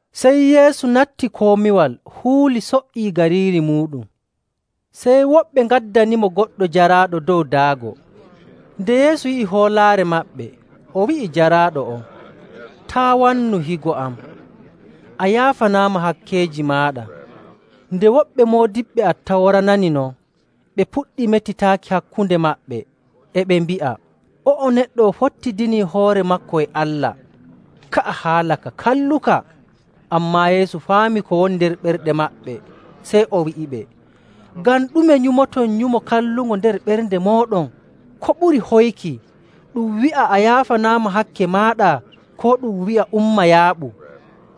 Sey Yeesu natti komiwal huuli so''ii gariiri muuɗum. Sey woɓɓe ngaddanimo goɗɗo jaraaɗo dow daago. Nde Yeesu yi'i hoolaare maɓɓe, o wi'i jaraaɗo on, “Taa' wannu, higo am, a yaafanaama hakkeeji maaɗa.” Nde woɓɓe moodiɓɓe Attawra nani non, ɓe puɗɗi metitaaki hakkunde maɓɓe, e ɓe mbi'a, “O'o neɗɗo o fottidini hoore maako e Allah. Ka'a haala ka kalluka.” Ammaa Yeesu faami ko woni nder ɓerɗe maɓɓe, sey o wi'iɓe, “Ngam ɗume nyumoton nyumo kallungo nder ɓerɗe mooɗon? Ko ɓuri hoyki, ɗum wi'a, ‘A yaafanaama hakke maaɗa,’ koo ɗum wi'a, ‘Umma yaaɓu?’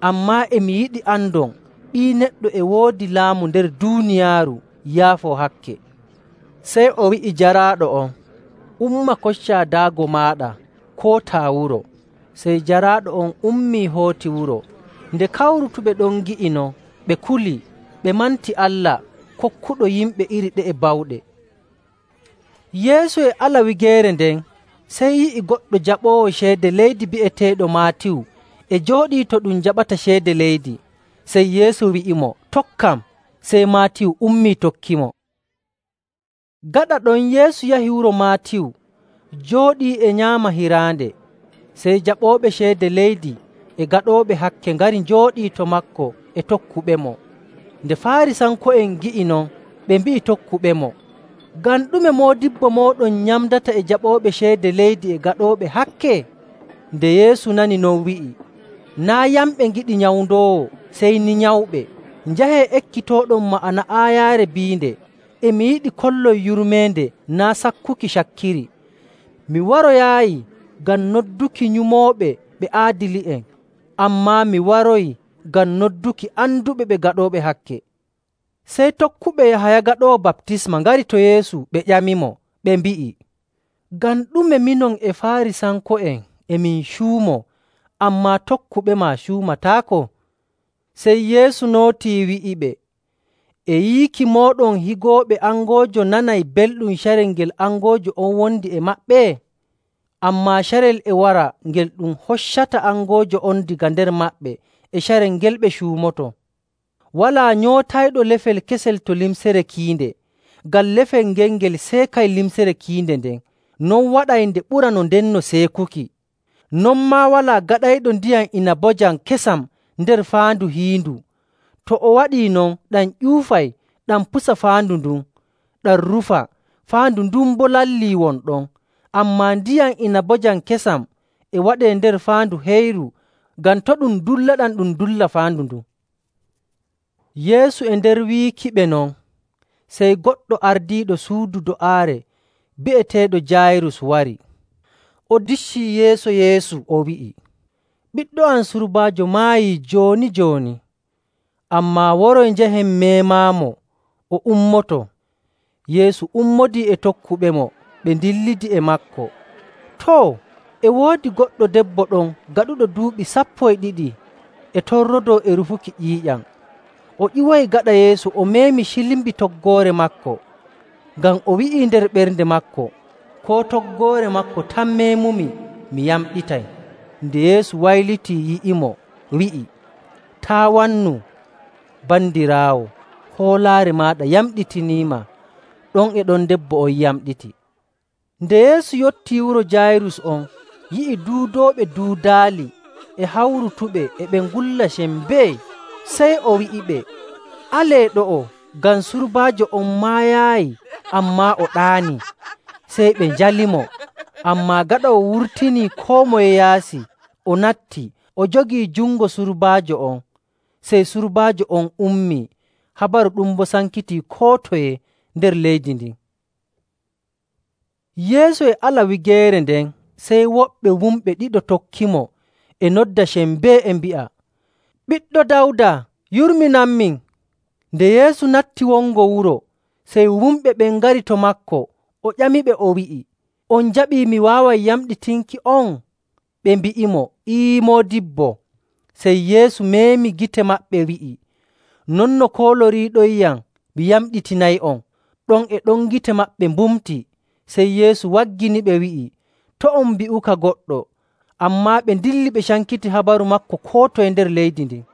Ammaa e mi yiɗi andon Ɓii Neɗɗo e woodi laamu nder duuniyaaru yaafoo hakke.” Sey o wi'i jaraaɗo on, “Umma koccaa daago maaɗa, kootaa wuro.” Sey jaraaɗo on ummii hooti wuro. Nde kawrutuɓe ɗon ngi'i non, ɓe kuli, ɓe manti Allah, kokkuɗo yimɓe iri ɗe'e bawɗe. Yeesu e ala wigeere nden, sey yi'i goɗɗo jaɓoowo ceede leydi bi'eteeɗo Maatiyu e jooɗii to ɗum jaɓata ceede leydi. Sey Yeesu wi'imo, “Tokkam.” Sey Maatiyu ummii, tokkimo. Gaɗa ɗon Yeesu yahi wuro Maatiyu, jooɗii e nyaama hiraande, sey jaɓooɓe ceede leydi e gaɗooɓe hakke ngari njooɗii to maako e tokkuɓemo. Nde Faarisanko'en ngi'i non, ɓe mbi'i tokkuɓemo, “Ngam ɗume moodibbo mooɗon nyamdata e jaɓooɓe ceede leydi e gaɗooɓe hakke?”. Nde Yeesu nani non, wi'i, “Naa' yamɓe ngiɗi nyawndoowo, sey ni nyawɓe. Njahee, ekkitooɗon ma'ana aayaare biinde, ‘E mi yiɗi kollon yurmeende, naa' sakkuki cakkiri.’. Mi waroyaayi ngam nodduki nyumooɓe ɓe aadili'en, ammaa mi waroyi ngam nodduki anduɓe ɓe gaɗooɓe hakke.”. Sey tokkuɓe Yahaya Gaɗoowo Baptisma ngari to Yeesu ɓe ƴamimo, ɓe mbi'i, “Ngam ɗume minon e Faarisanko'en e min cuumoo, ammaa tokkuɓema cuumataako?” Sey Yeesu nootii wi'iɓe, “E yiiki mooɗon higooɓe angoojo nanay belɗum carel ngel angoojo on wondi e maɓɓe? Ammaa carel e wara ngel ɗum hoccata angoojo on daga nder maɓɓe, e carel ngel ɓe cuumoto. “Walaa nyootayɗo lefel kesel to limcere kiinde, ngam lefel ngel ngel seekay limcere kiinde nden. Non waɗay nde ɓura no ndenno seekuki. Non maa walaa gaɗayɗo ndiyam inabojam kesam nder faandu hiindu. To o waɗii non, ɗam ƴuufay, ɗam pusa faandu ndun, ɗam rufa, faandu ndun boo lalli won ɗon. Ammaa ndiyam inabojam kesam e waɗee nder faandu heyru ngam to' ɗum dullaɗam ɗum dulla faandu ndun.” Yeesu e nder wiikiɓe non, sey goɗɗo ardiiɗo suudu do'aare bi'eteeɗo Jaayirus wari. O diccii yeeso Yeesu, o wi'i, “Ɓiɗɗo am surbaajo maayii jooni‑jooni, ammaa waroy njahen meemaamo, o ummoto.” Yeesu ummodii e tokkuɓemo ɓe ndillidi e maako. Too, e woodi goɗɗo debbo ɗon gaɗuɗo duuɓi sappo e ɗiɗi e torrodoo e rufuki ƴiiƴam o ƴiwoyi gaɗa Yeesu, o meemi cilmbi toggoore maako. Ngam o wi'ii nder ɓernde maako, “Koo toggoore maako tan meemumi, mi yamɗitay.” Nde Yeesu waylitii, yi'imo, wi'i, “Taa' wannu, bandiraawo. Hoolaare maaɗa yamɗitiniima.” Ɗon e ɗon debbo on yamɗiti. Nde Yeesu yottii wuro Jaayirus on, yi'i duudooɓe duudaali e hawrutuɓe e ɓe ngulla sembee, sey o wi'iɓe, “Alee ɗo'o, ngam surbaajo on maayaayi, ammaa o ɗaani.” Sey ɓe njalimo. Ammaa gaɗa o wurtinii koo moye yaasi, o natti, o jogii jungo surbaajo on, sey surbaajo on ummii. Habaru ɗum boo sankitii koo toye nder leydi ndin. Yeesu e ala wigeere nden, sey woɓɓe wumɓe ɗiɗo tokkimo e nodda sembee, e mbi'a, “Ɓiɗɗo Dawda, yurminanmin!” Nde Yeesu natti wongo wuro, sey wumɓe ɓen ngari to maako, o ƴamiɓe, o wi'i, “On njaɓii mi waaway yamɗitinki'on?” Ɓe mbi'imo, “Ee, moodibbo.” Sey Yeesu meemi gite maɓɓe, wi'i, “Non no kooloriiɗonyam mi yamɗitinay'on.” Ɗon e ɗon gite maɓɓe mbumtii. Sey Yeesu wagginiɓe, wi'i, “To' on mbi'uka goɗɗo.” Ammaa ɓe ndilli ɓe cankiti habaru maako koo toye nder leydi ndin.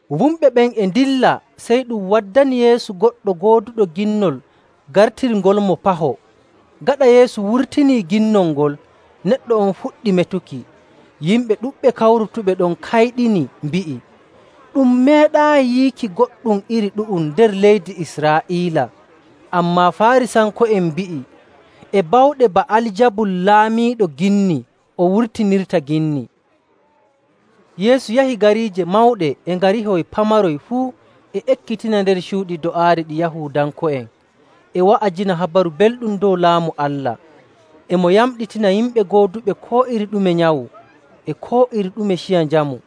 Wumɓe ɓen e ndilla, sey ɗum waddani Yeesu goɗɗo gooduɗo ginnol gartirngolmo paho. Gaɗa Yeesu wurtinii ginnol ngol, neɗɗo on fuɗɗi metuki. Yimɓe ɗuɗɓe kawrutuɓe ɗon kayɗini, mbi'i, “Ɗum meeɗaayi yiiki goɗɗum iri ɗu'um nder leydi Israa'iila.” Ammaa Faarisanko'en mbi'i, “E bawɗe Ba'aljabul laamiiɗo ginni o wurtinirta ginni.”. Yeesu yahi gariije mawɗe e ngarihoy pamaroy fuu, e ekkitina nder cuuɗi do'aare ɗi Yahuudanko'en, e wa'ajina Habaru Belɗum dow Laamu Allah, e mo yamɗitina yimɓe gooduɓe koo iri ɗume nyawu, e koo iri ɗume ciya njamu..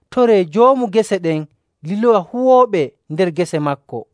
Toree Joomu gese ɗen liloya huwooɓe nder gese maako.”.